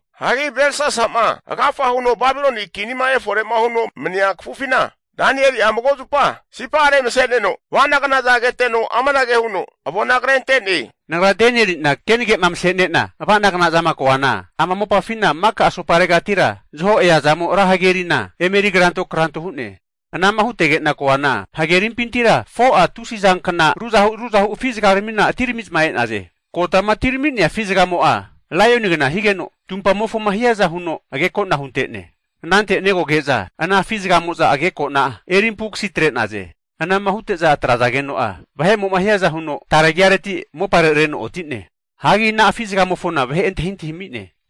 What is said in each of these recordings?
Hagi Belsasa'ma agafa huno Babiloni kinima efore'ma huno mania kafufina, Danieli'a mago zupa sipa'are mase'neno ava'nagnaza keteno amanage huno avona krente'ne. Nagra Danieli'na kenage'ma mase'nena ava'nagna zama koana, ama mopafina maka asoparegatira zaho eazamo ra hagerina emeri kranto kranto hu'ne. Anama hutege'na koana, hagerimpintira 4'a tusizankna ruzahu ruzahu afi'zaga atiramiza e'naze. Kotama atirami'nea afi zagamo'a laionigna higeno, tumpamofoma hiaza huno ageko'na hunte'ne. Anante negoge'za ana afi'zagamofo ageko'na eri ampukasi atre'naze. Anama hute'za atrazageno'a vahe'mo'ma hiaza huno, tare agiareti mopare reno oti'ne. Hagi ana afi'zagamofona vahe antahintahi ami'ne.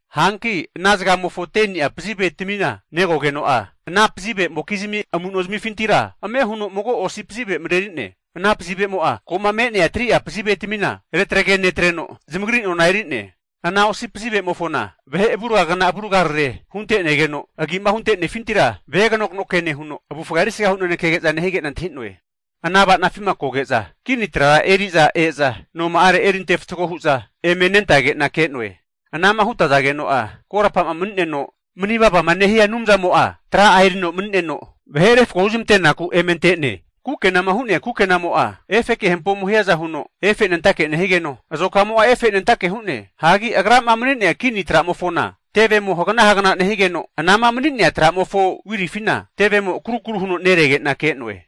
Hanki ana zagamofo 10ni'a pazivetamima negogeno'a, ana pazivemokizmi amu'no zamifintira ame huno mago osi pazive mareri'ne. Ana pazivemo'a ko'ma me'nea 3'a pazivetamina retagre netreno, zamagri nona eri'ne. Ana osi pazivemofona vahe avurgagna avurgarare hunte'negeno, agi'ma hunte'nefintira veganokno ke nehuno, avufga erisgahu naneke nehige'na antahi'noe. Ana ava'nafima koge'za kini trara eri'za e'za noma'are erinte fatgo hu'za eme nentage'na ke'noe. Anama hutazageno'a korapa'ma mani'neno, mani vava nehia Anumzamo'a tra'a erino mani'neno vahe refko huzmantenaku eme ante'ne. Kukenama hu'nea kukenamo'a efeke hampomo hiaza huno efenentake nehigeno, azokamo'a efenentake hu'ne. Hagi agrama mani'nea kini tra'mofona tevemo hagna hagna nehigeno, anama mani'nea tra'mofo wirifina tevemo akarukaru huno nerege'na ke'noe.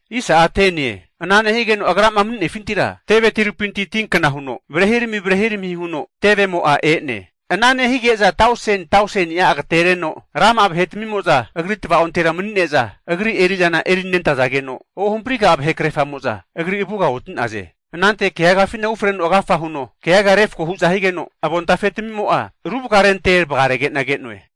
Ana nehigeno agrama mani'nefintira teve tirupinti tinkna huno varehirami varehirami huno tevemo'a e'ne. Ana nehige'za tausen tausenia agatereno rama'a vahetamimo'za agri tvaontera mani'neza agri eri'zana erinentazageno, ohampriga'a vahe krerfamo'za Agri avuga oti'naze. Anante keagafina ufreno agafa huno keaga refko hu'za higeno, avontafe tamimo'a ru vakarente vagarege'na ke'noe.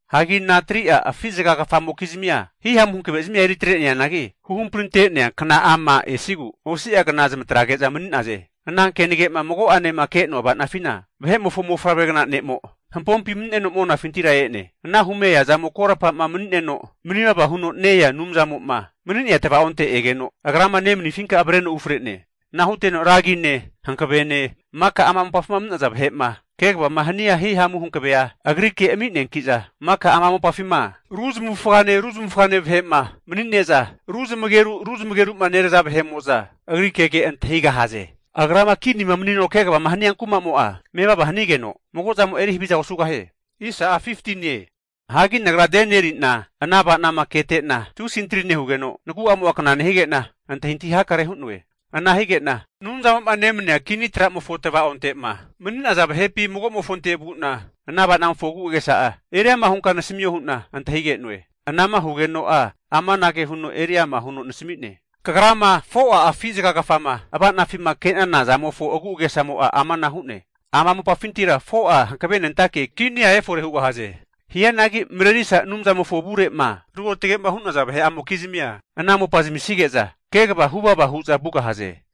Hagi ana 3'a afi zaga kafamokizmia hihamu hankave zamia eri atre'neanagi, huhampri ante'nea kna'ama esigu osi'a kna zamatrege'za mani'naze. Ana kenage'ma mago'anema ke'noa ava'nafina, vahe'mofo mofavregna ne'mo hampompi mani'neno monafintira e'ne. Ana hume eazamo korapa'ma mani'neno manivava huno ne-ea Anumzamo'ma mani'nea tavaonte egeno agrama nemanifinka avreno ufre'ne. Ana huteno ragine, hankavene maka ama mopafima mani'naza vahe'ma kegavama hania hihamu hankavea agrike ami'neanki'za, maka ama mopafima ru zamavufagane ru zamavufagane vahe'ma mani'ne'za, ru zamageru ru zamageru'ma neraza vahe'mo'za agri kege antahigahaze. Agrama kinima manino kegavama hania kumamo'a, mevava hanigeno mago zamo'a eri haviza osugahie. Hagi nagra Danieli'na ana ava'nama ketena tusi antri nehugeno, nagu'amo'a kna nehige'na, antahintahi hakare hu'noe. Ana hige'na Anumzamo'ma nemania kini tra'mofo tvaonte'ma mani'za vahepi mago'mofonte vu'na, ana ava'namofo agu'agesa'a eri ama hunka nasamio hu'na antahige'noe. Anama hugeno'a amanage huno eri ama huno nasami'ne. Kagrama 4'a afi zagagafama ava'nafima ke'nana zamofo agu'agesamo'a amana hu'ne, ama mopafintira 4'a hankavenentake kinia efore hugahaze. Hianagi marerisa Anumzamofo avure'ma ruotage'ma hu'naza vahe'amokizmia, ana mopa zamisnige'za kegava hu vava hu'za vugahaze.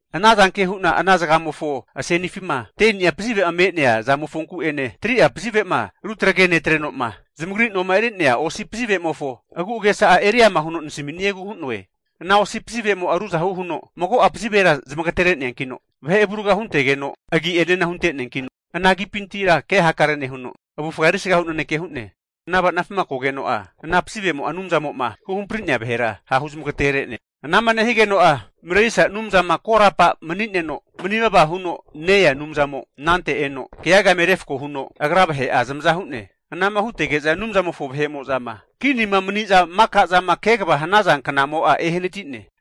Anazanke hu'na ana zagamofo asenifima 10ni'a pazive'ma me'nea zamofonku'ene, 3'a pazive'ma retagare netreno'ma zamagri noma eri'nea osi pazive'mofo agu'agesa'a eri ama huno nasamisniegu hu'noe. Ana osi pazivemo'a ruzahu huno mago'a pazivera zamagatere neankino, vahe avurga huntegeno agi'enena hunte'neankino, ana agipintira ke hakarea nehuno avufga erisga hu naneke hu'ne. Ana ava'nafima kogeno'a ana pazivemo'a Anumzamo'ma huhampri'nea vahera ha' huzmagatere'ne. Anama nehigeno'a Marerisa Anumzama korapa mani'neno mani vavama huno ne-ea Anumzamo anante eno, keaga eme refko huno agra vahe'a zamaza hu'ne. Anama hutege'za Anumzamofo vahe'mo'zama kinima mani'za maka zama kegavama hanaza knamo'a ehanati'ne.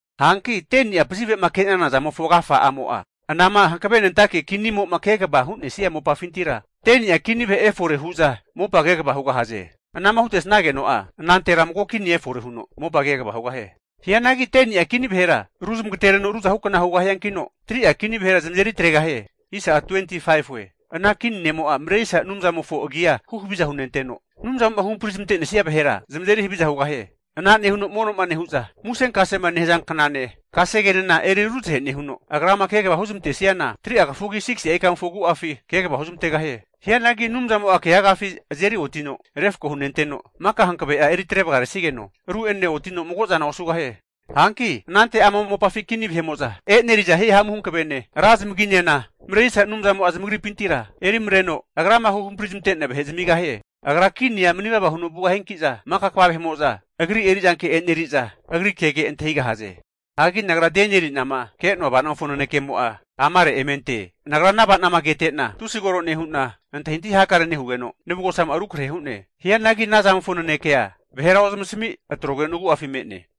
Hanki 10ni'a pazive'ma ke'nana zamofo agafa'amo'a, anama hankavenentake kinimo'ma kegavama hu'nesnia mopafintira 10ni'a kini vahe efore hu'za mopa kegava hugahaze. Anama hutesnageno'a, anantera mago kini efore huno mopa kegava hugahie. Hianagi 10ni'a kini vahera ru zamagtereno ruzahukna hugahiankino, 3'a kini vahera zamazeri atregahie. Ana kini ne'mo'a Marerisa Anumzamofo agia huhaviza hunenteno, Anumzamo'ma huhampari zamante'nesnia vahera zamazeri haviza hugahie. Ana nehuno mono'ma nehu'za musenkasema nehaza knane, kasegenena eri ruzahe nehuno, agrama kegavama huzmantesniana 3'a kafugi 6si'a ikamofo agu'afi kegava huzmantegahie. Hianagi Anumzamo'a keagafi azeri otino refko hunenteno, maka hankave'a eri atrevaga resnigeno ru'enena otino mago zana osugahie. Hanki anante ama mopafi kini vahe'mo'za e'neriza hihamu hankavene, ra zamaginena Marerisa Anumzamo'a zamagripintira erimareno, Agrama huhampari zamante'nea vahe zamigahie. Agra kinia mani vava huno vugahianki'za, maka kva vahe'mo'za agri eri'zanke eneri'za agri kege antahigahaze. Hagi nagra Danieli'nama ke'noa ava'namofo nanekemo'a amare emente. Nagra ana ava'nama kete'na tusi koro nehu'na antahintahi hakare nehugeno, navugosamo'a rukrahe hu'ne. Hianagi ana zamofo nanekea vahera ozamasami atrogeno nagu'afi me'ne.